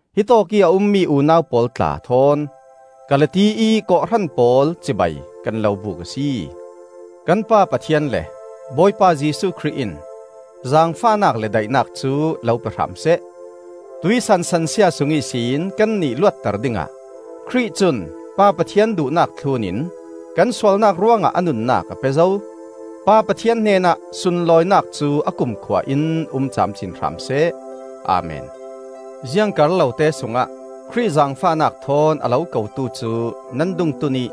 Hitawkih a ummi unau pawl tla thawn Galati ih kawhhran pawl cibai kan lo buk a si. Kan Pa Pathian le Bawipa Jesuh Khrih in zaangfahnak le daihnak cu lo pe hram seh. Tuihsan sansia sung ihsin kannih luatter dingah Khrih cun Pa Pathian duhnak thlun in kan sualnak ruangah a nunnak a pe zo. Pa Pathian hnenah sunlawinak cu a kumkhua in um camcin hram seh! Amen. Ziang kar lote sungah Khrih zaangfahnak thawn a lo kotu cu nan dungtun ih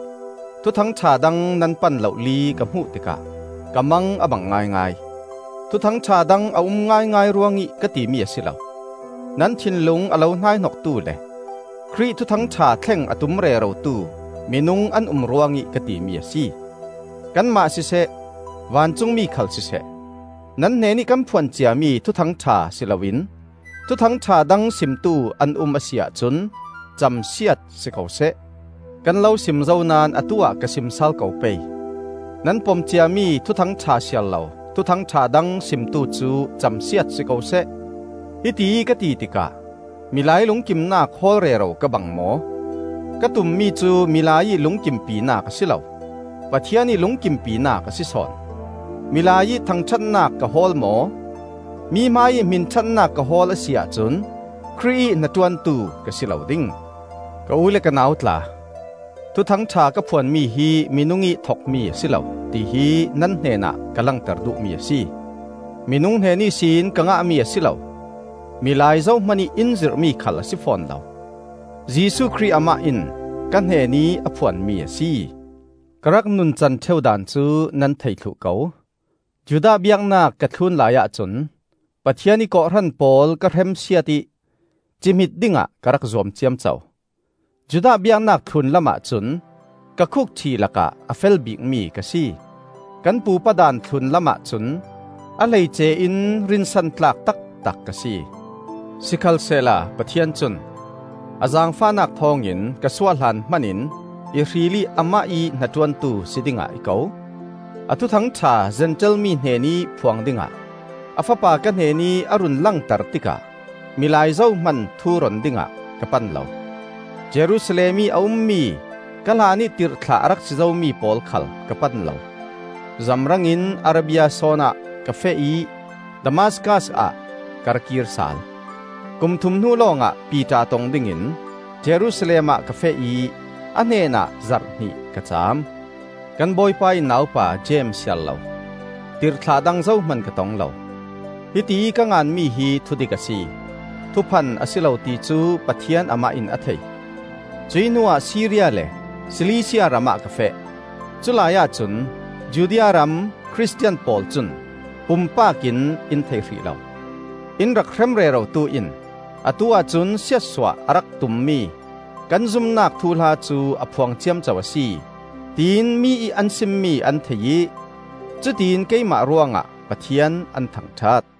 Thuthang ṭha dang nan pan lohli ka hmuh tikah ka mang a bang ngaingai. ‘Thuthang ṭha dang,’ a um ngaingai ruangih ka timi a si lo; nan thinlung a lo hnaihnoktu le Khrih Thuthang ṭha thleng a tum rerotu minung an um ruangih ka timi a si. Kanmah siseh, vancungmi khal siseh, nan hnenih kan phuan ciami Thuthang ṭha si loin thuthangṭha dang simtu an um a si ahcun camsiat si ko seh! Kan lo sim zo naón atu-ah ka sim sal ko pei: nan pom ciami Thuthang ṭha siarlo thuthangṭha dang simtu cu camsiat si ko seh. Hitiih ka ti tikah milai lungkimnak hawl rero ka bang maw? Ka tummi cu milai ih lungkimpinak a si lo; Pathian ih lungkimpinak a si sawn. Milai ih thangṭhatnak ka hawl maw? Mi hmaiih hminṭhatnak ka hawl a si ahcun Khrih ih hnaṭuantu ka si lo ding. Ka u le ka nau tla, Thuthang ṭha ka phuanmi hi minung ih thokmi a si lo, tihi nan hnenah ka langter duhmi a si. Minung hnen ihsin ka ngahmi a si lo; milai zohmanih in zirhmi khal a si fawn lo. Jesuh Khrih amah in ka hnenih a phuanmi a si. Ka rak nuncan ṭheu daan cu nan thei thluh ko. Judah biaknak ka thlun laiah cun Pathian ih kawhhran pawl ka hremsiat ih cihmit dingah ka rak zuam ciamco. Judah biaknak thlun lamah cun ka khukṭhi lakah a fel bikmi ka si. Kan pupa daan thlun lamah cun a hleice in rinsan tlak taktak ka si. Sikhalsehla Pathian cun a zaangfahnak thawngin ka suah hlan hmanin i hril ih amah ih hnaṭuantu si dingah i ko. A Thuthang ṭha Zentail mi hnenih phuang dingah, a Fapa ka hnenih a run langter tikah milai zohman thuron dingah ka pan lo. Jerusalem ih a ummi ka hlanih tirhthlah a rak si zomi pawl khal ka pan lo. Zamrang in Arabia sawn ah ka feh ih Damaskas ah ka ra kir sal. Kum thum hnu lawngah Piter tong dingin Jerusalem ah ka feh ih a hnenah zarh hnih ka caam. Kan Bawipa ih naupa Jeim siarlo, tirhthlah dang zohman ka tong lo. Hitiih ka nganmi hi thudik a si; thuphan a si lo ti cu Pathian Amah in a thei. Cuih hnuah Siria le Silisia ramah ka feh. Culai ahcun Judea ram Khristian pawl cun pumpak in in thei hrih lo. “In rak hrem rerotu in atu-ah cun siatsuah a rak tummi kan zumnak thuhla cu a phuang ciamco a si,” tiin mi ih an simmi an thei ih, cutiin keimah ruangah Pathian an thangṭhat.